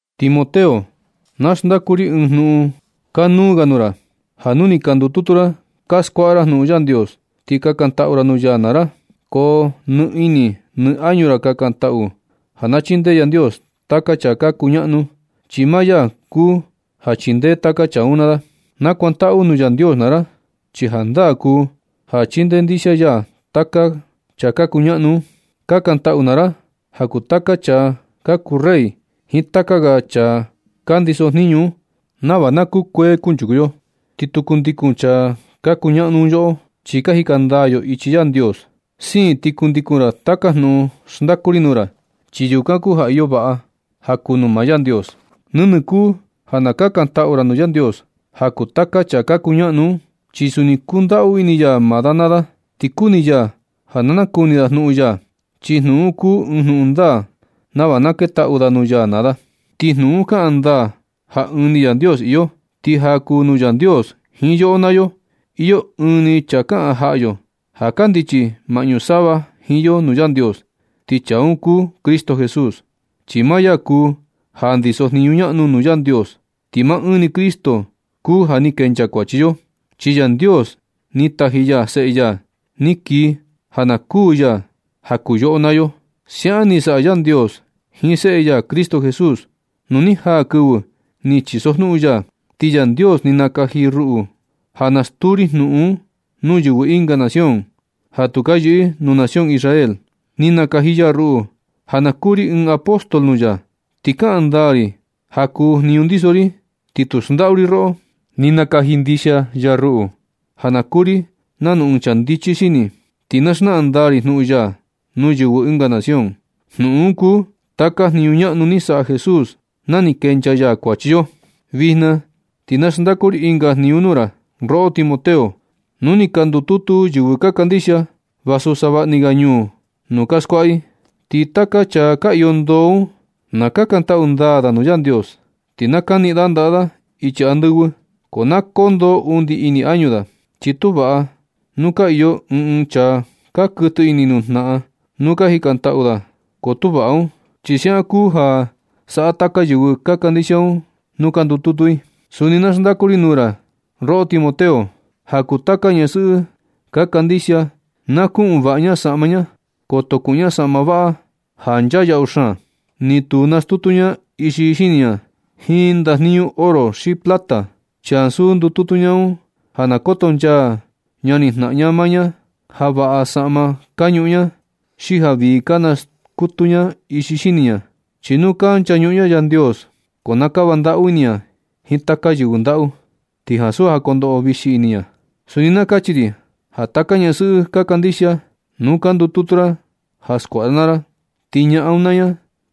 Timoteo, na xndaku ri ɨɨn jnuꞌun kanuu ga nuu ra, ja nu ni ka ndututu ra ka skuaꞌa ra jnuꞌun Yandios, ti kakantaꞌu nuu ya naa ra, ko nɨ ini nɨ añu ra kakantaꞌu ja na chindee Yandios taka chaa ka kuñaꞌnu, chi maa ya kuu ja chindee taka chaa un naa da. Nakuantaꞌu nuu Yandios naa ra, chi jandaa kuu ja chindee ndixia ya taka chaa ka kuñaꞌnu un. Kakantaꞌu naa ra ja kuu taka chaa ka kuu rey jiin taka ga chaa ka ndiso jniñu un nava na kukuee kunchuku yo, ti tu kundikun chaa ka kuñaꞌnu un yoꞌo, chi ka jika ndaa yo ichi Yandios. Siin ti kundikun ra taka jnuꞌun xndaku ri nuu ra, chi yukan kuu ja iyo vaꞌa ja kuu nuu maa Yandios. Nɨnɨ kuu ja na kakantaꞌu ra nuu Yandios ja kuu taka chaa ka kuñaꞌnu un, chi suni kundaꞌu ini ya maa da naa da. Ti kuni ya ja na nakuni da jnuꞌun ya, chi jnuꞌun un kuu ɨɨn jnuꞌun ndaa nava na ketaꞌu da nuu ya naa da. Ti jnuꞌun un kaꞌan ndaa ja ɨɨn ni Yandios iyo, ti ja kuu nuu Yandios jiin yoꞌo naa yo, iyo ɨɨn chaa kaꞌan jaꞌa yo ja kandichi maꞌñu sava jiin yo nuu Yandios, ti chaa un kuu Cristo Jesús, chi maa ya kuu ja ndiso jniñu ñaꞌnu nuu Yandios. Ti maa ɨɨn ni Cristo kuu ja ni kenchaa kuachi yo, chi Yandios ni taji ya Seꞌe ya ni kii ja na kuū ya ja kuu yoꞌo naa yo. Siaꞌan ni saꞌa Yandios jiin Seꞌe ya Cristo Jesús nu ni jaa kɨvɨ ni chisojnuꞌun ya. Ti Yandios ni nakaji ya ruꞌu ja na stuu ri jnuꞌun un nuu yɨvɨ ɨnga nación ja tu ka yɨꞌɨ nuu nación Israel. Ni nakaji ya ruꞌu ja na kuu ri ɨɨn apóstol nuu ya. Ti kaꞌan ndaa ri ja kuu jniñu ndiso ri, ti tu xndaꞌu ri roꞌo. Ni nakaji ndixia ya ruꞌu ja na kuu ri nanu ɨɨn chaa ndichi xini, ti na xnaꞌan ndaa ri jnuꞌun ya nuu yɨvɨ ɨnga nación. Jnuꞌun un kuu taka jniñu ñaꞌnu ni saꞌa Jesús na ni kenchaa ya kuachi yo. Vijna ti na xndaku ri ɨnga jniñu nuu ra, roꞌo Timoteo. Nu ni ka ndututu yɨvɨ ka kandixia, vasu savaꞌni ga ñuu nuu ka skuaꞌa i. Ti taka chaa ka iyo ndoo un, na kakantaꞌu ndaa da nuu Yandios. Ti na kaniꞌin da ndaꞌa da ichi andɨvɨ, ko na kondoo undi ini añu da. Chi tu vaꞌa nu ka iyo ɨɨn ɨɨn chaa ka kuɨtɨ ini nuu jnaꞌan nuu ka jikantaꞌu da, ko tu vaꞌa un. Ti siaꞌan kuu ja saꞌa taka yɨvɨ ka kandixia un nuu ka ndututu i. Suni na xndaku ri nuu ra, roꞌo Timoteo, ja kuu taka ñasɨꞌɨ ka kandixia. Na kuꞌun vaꞌa ña saꞌma ña. Koto kuꞌun ña saꞌma vaꞌa ja nchaa yaꞌu xaan. Ni tu naskutu ña ixi xini ña jiin ndajniñu oro xi plata, chi ansu ndututu ña un ja na kotonchaa ñani jnaꞌan ña maa ña ja vaꞌa saꞌma ka ñuꞌun ña, xi ja vii ka naskutu ña ixi xini ña. Chi nu ka nchañuꞌun ña Yandios, ko na kava ndaꞌu ini ña jiin taka yɨvɨ ndaꞌu, ti ansu ja kondoꞌo vixi ini ña. Suni na kachi ri ja taka ñasɨꞌɨ ka kandixia, nuu ka ndututu ra ja skuaꞌa ra naa ra, ti ñaꞌan un naa ña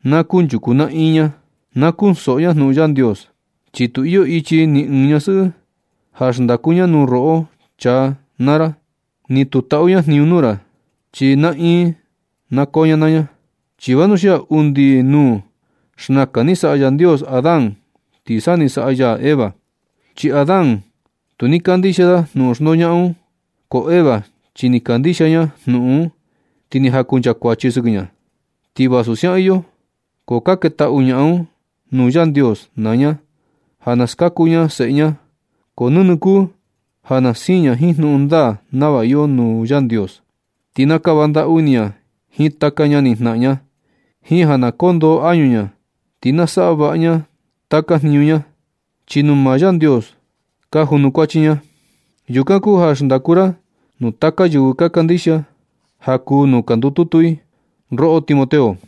na kunchuku naꞌin ña, na kunsoꞌo ña jnuꞌun Yandios. Chi tu iyo ichi ɨɨn ñasɨꞌɨ ja xndaku ña nuu roꞌo chaa naa ra, ni tu taꞌu ña jniñu nuu ra, chi naꞌin na koo ña naa ña. Chi vanuxia undi nuu, xnakan ni saꞌa Yandios Adán ti sa ni saꞌa ya Eva. Chi Adán tu ni kandixia da jnuꞌun xndoñaꞌan un, ko Eva chi ni kandixia ña jnuꞌun un, ti ni jakunchakuachi sɨkɨ ña. Ti vasu siaꞌan iyo, ko ka ketaꞌu ñaꞌan un nuu Yandios naa ña ja ka skaku ña seꞌe ña, ko nɨnɨ kuu ja na siin ña jiin jnuꞌun ndaa nava iyo nuu Yandios. Ti na kava ndaꞌu ini ña jiin taka ñani jnaꞌan ña jiin ja na kondoo añu ña. Ti na saꞌa vaꞌa ña taka jniñu ña, chi nuu maa Yandios ka junukuachi ña. Yukan kuu ja xndaku ra nuu taka yɨvɨ ka kandixia ja kuu nuu ka ndututu i, roꞌo Timoteo.